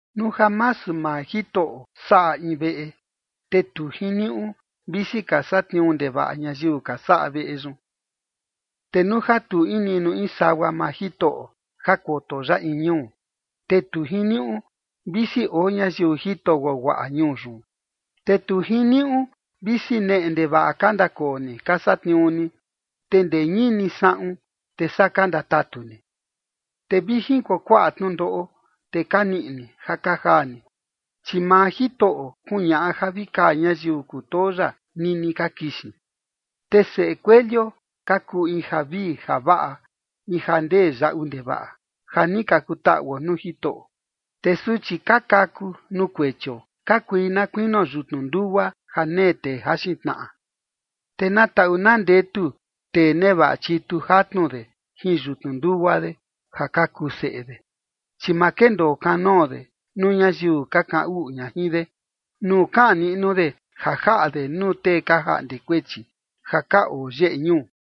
Nuu ja masu maa Jitoꞌo saꞌa in veꞌe, te tu jiniuꞌu, visi ka satniuu ndevaꞌa ñayiu ka saꞌa veꞌe yun. Te nuu ja tu in niꞌnu in sagua maa Jitoꞌo ja koto ya in ñuu, te tu jiniuꞌu, visi oo ñayiu jito guaguaꞌa ñuu yun. Te tu jiniuꞌu visi neꞌe ndevaꞌa ka ndakoo ni ka satniuu ni, te ndee ñini saꞌun, te saa ka ndatatu ni, te vi jin kuakuaꞌa tnundoꞌo, te ka niꞌi ni ja ka jaa ni. Chi maa Jitoꞌo kuñaꞌa ja vi kaa ñayiu kutoo ya nini ka kixin. Te seꞌe kuelio ka kuu in javii javaꞌa, in ja ndee yaꞌu ndevaꞌa, ja ni ka kutaꞌuo nuu Jitoꞌo. Te suchi ka kaku nuu kuechio ka kui na kuinio yutnu ndugua ja nee tee jaxin tnaꞌa. Te na taꞌu na ndetu tee nevaꞌa chitu jatnu de jin yutnu ndugua de, ja ka kuu seꞌe de, chi ma kendoo kanoo de nuu ñayiu ka kaꞌan uꞌu ña jin de nuu kaꞌan niꞌnu de ja jaꞌa de nuu tee ka jaꞌnde kuechi ja ka oo yeꞌe ñuu.